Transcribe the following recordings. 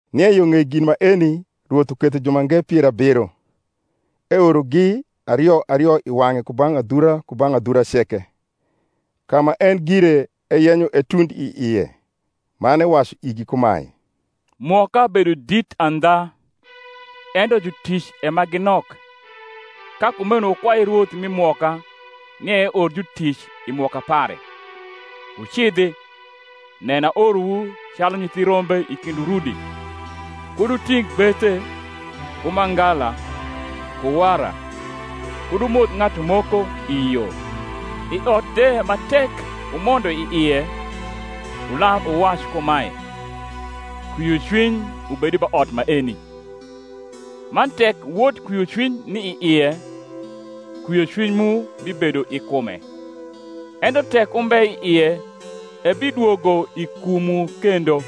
Nie yo ng’ei gin maeni Rwoth uketho jumange pier abiro, eorogi ario ario i wang’e kubang’ adhura kubang’ adhura ceke, ka ma en gire eyenyo etund i ie. Man ewacu igi kumae, Mwoka bedo dit andha, ento jutic e ma gi nok: ka kumeno wukwai Rwoth mi mwoka, nia eor jutic i mwoka pare. Wucidhi; nen, aorowu calu nyithi rombe i kind urudi. Kud wuting’ gbethe, ku mangala, ku wara, kud wumoth ng’atu moko i yo. I ot de ma tek wumondo i ie, wular wuwac kumae, Kwiocwiny ubed ba ot maeni. Man tek wod kwiocwiny ni i ie, kwiocwiny mu bibedo i kume: ento tek umbe i ie, ebidwogo i kumwu kendo.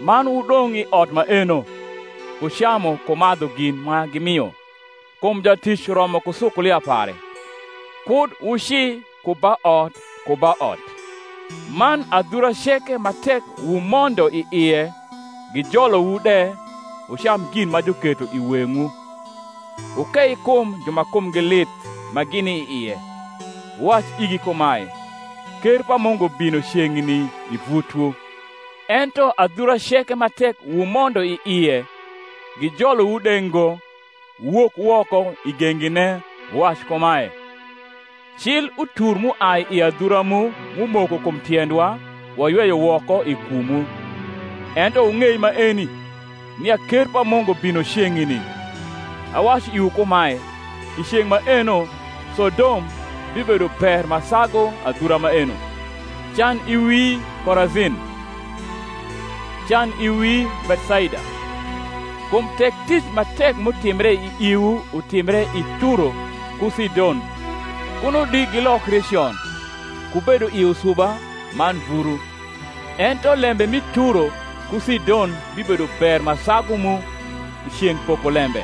Man wudong’ i ot maeno, ku camu ku madhu gin ma gimio: kum jatic romo ku sukulia pare. Kud wuci ku ba ot ku ba ot. Man adhura ceke ma tek wumondo i ie, gijolowu de, wucam gin ma juketho i weng’wu: wukei kum ju ma kumgi lith ma gini i ie, wuwac igi kumae, Ker pa Mungu bino ceng’ni i vutwu. Ento adhura ceke ma tek wumondo i ie, gijolowu de ngo, wuwok woko i gengine wuwac kumae, Cil utur m’uai i adhura mu, m’umoko kum tiendwa, wayweyo woko i kumwu: ento wung’ei maeni, nia ker pa Mungu bino ceng’ni. Awacu iwu kumae, I ceng’ maeno Sodom bibedo ber ma sagu adhura maeno. Can i wii, Korazin! can i wii, Bethsaida! kum tek tic ma tek m’utimbre i iwu utimbre i Turo ku Sidon, kuno di gilokri con, ku bedo i usuba man vuru. Ento lembe mi Turo ku Sidon bibedo ber ma sagu mu, i ceng’ pokolembe.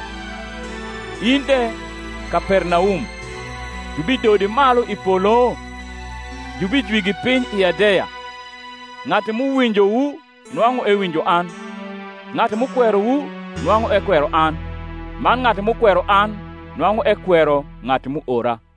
In de, Kapernaum, jubidodi malu i polo? jubijwigi piny i Hadeya. Ng’atu m’uwinjowu nwang’u ewinjo an; ng’atu m’ukwerowu nwang’u ekwero an; man ng’atu m’ukwero an nwang’u ekwero ng’atu m’uora.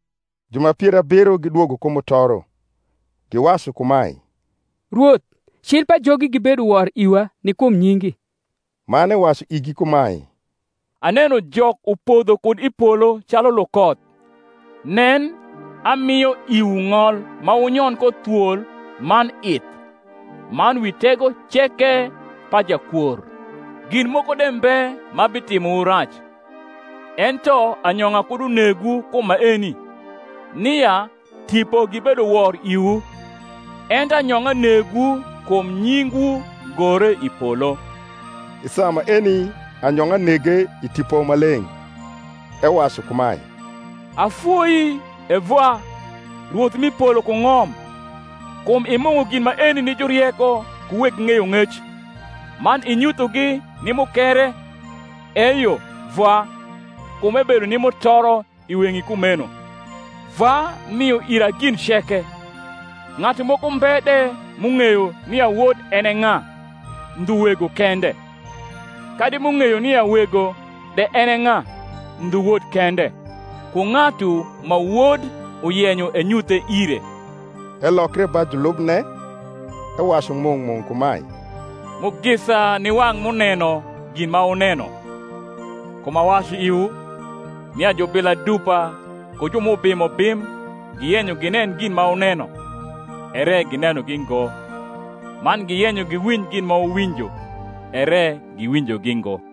Ju ma pier abiro gidwogo ku mutoro, giwacu kumae, Rwoth, cil pajogi gibedo wor iwa ni kum nyingi. Man ewacu igi kumae, Aneno Jok upodho kud i polo calu lukoth. Nen, amio iwu ng’ol ma wunyon ko thwol man ith, man wi tego ceke pa jakwor: gin moko de mbe ma hitimowu rac. Ento anyong’a kud unegwu kum maeni, nia tipo gibedo wor iwu; ento anyong’a negwu kum nyingwu gore i polo. I saa maeni anyong’a nege i Tipo Maleng’, ewacu kumae, Afoii, E Vwa, Rwoth m’i polo ku ng’om, kum imung’o gin maeni ni jurieko ku weg ng’eyong’ec, man inyuthogi ni mukere: eyo, Vwa; kum ebedo ni mutoro i weng’i kumeno. Vwa mio ira gin ceke: ng’atu moko mbe de m’ung’eyo nia Wod en e ng’a, ndhu Wego kende; kadi m’ung’eyo nia Wego de en e ng’a, ndhu Wod kende, ku ng’atu ma Wod uyenyo enyuthe ire. Elokre ba julubne, ewacu mung’ mung’ kumae, Mugisa ni wang’ m’uneno gin ma wuneno: kum awacu iwu, nia jubila dupa ku ju m’ubimo bim giyenyo ginen gin ma wuneno, ere ginenogi ngo; man giyenyo giwinj gin ma wuwinjo, ere giwinjogi ngo.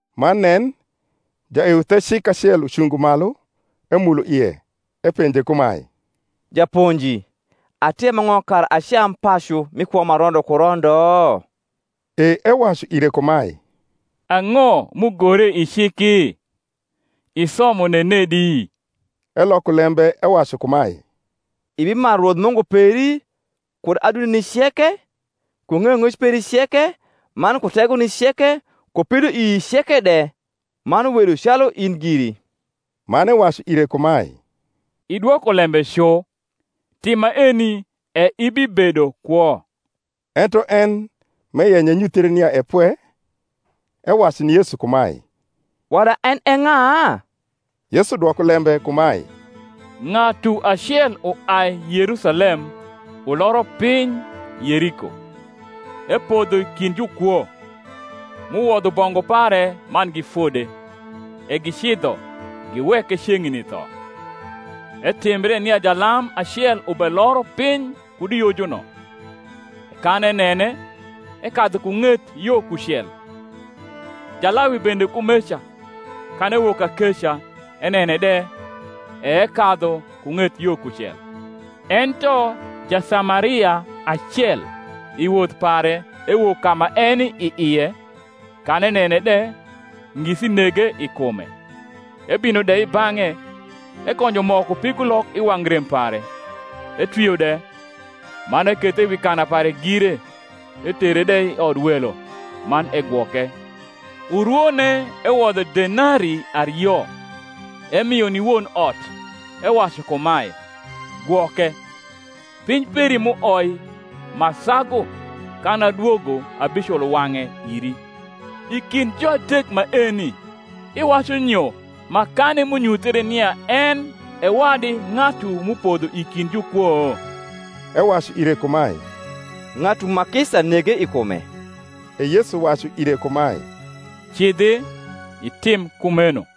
Man nen, jaeuthecik acel ucungo malu emulo ie, epenje kumae, Japonji, atim ang’o kara acam pacu mi kwo ma rondo ku rondo? E ewacu ire kumae, Ang’o m’ugore i ciki? isomo nenedi? Eloko lembe ewacu kumae, Ibimaru Rwoth Mungu peri kud adundeni ceke, ku ng’eyong’ec peri ceke, man ku tegoni ceke, ku pidoii ceke de; man wedu calu in giri. Man ewacu ire kumae, Idwoko lembe cu: tim maeni, e ibibedo kwo. Ento en, m’eyenyo enyuthre nia e pwe, ewacu ni Yesu kumae, Wada en e ng’a? Yesu dwoko lembe kumae, Ng’atu acel uai Yerusalem uloro piny Yeriko; epodho i kind jukwo, m’uwodho bongu pare man gifode, e gicidho, giweke ceng’ni tho. Etimbre nia jalam acel ubeloro piny kud i yojuno: e kan enene, ekadhu ku ng’et yo kucel. Jalawi bende kumeca, kan ewok kakeca, enene de, e ekadhu ku ng’et yo kucel. Ento Jasamaria acel, i woth pare, ewok ka ma eni i ie: kan enene de, ngisi nege i kume, ebino de i bang’e, ekonjo mo ku pigulok i wang’ rem pare, etwio de; man ekethe wi kana pare gire, etere de i odwelo, man egwoke. Urwone ewodho denarii ario, ernio ni won ot, ewacu kumae, Gwoke; piny peri m’uoi ma sagu, kan adwogo, abiculo wang’e iri. I kind juadek maeni, iwacu nyo, makani m’unyuthre nia en e wadi ng’atu m’upodho i kind jukwo? Ewacu ire kumae, Ng’atu ma kisa nege i kume. E Yesu wacu ire kumae, Cidhi, itim kumeno.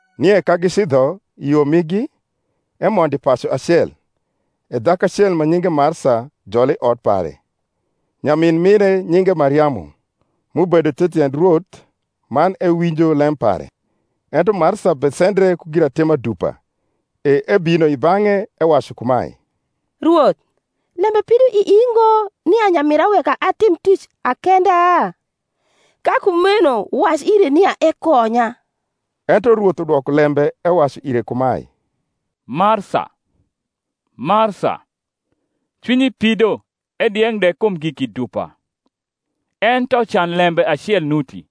Nie ka gicidho i yo migi, emondo i pacu acel: e dhaku acel ma nyinge Marsa jole i ot pare. Nyamin mire nyinge Mariamu, m’ubedo the tiend Rwoth man ewinjo lem pare. Ento Marsa besendre ku giratima dupa; e ebino i bang’e, ewacu kumae, Rwoth, lembe pido ii ngo nia nyamira weka atim tic akenda? ka kumeno wac ire nia ekonya. Ento Rwoth udwoko lembe ewacu ire kumae, Marsa, Marsa, cwinyi pido edieng’ de kum giki dupa: ento can lembe acel nuti: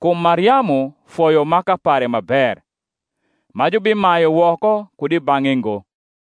kum Mariamu foyo maka pare ma ber, ma jubimayu woko kud i bang’e ngo.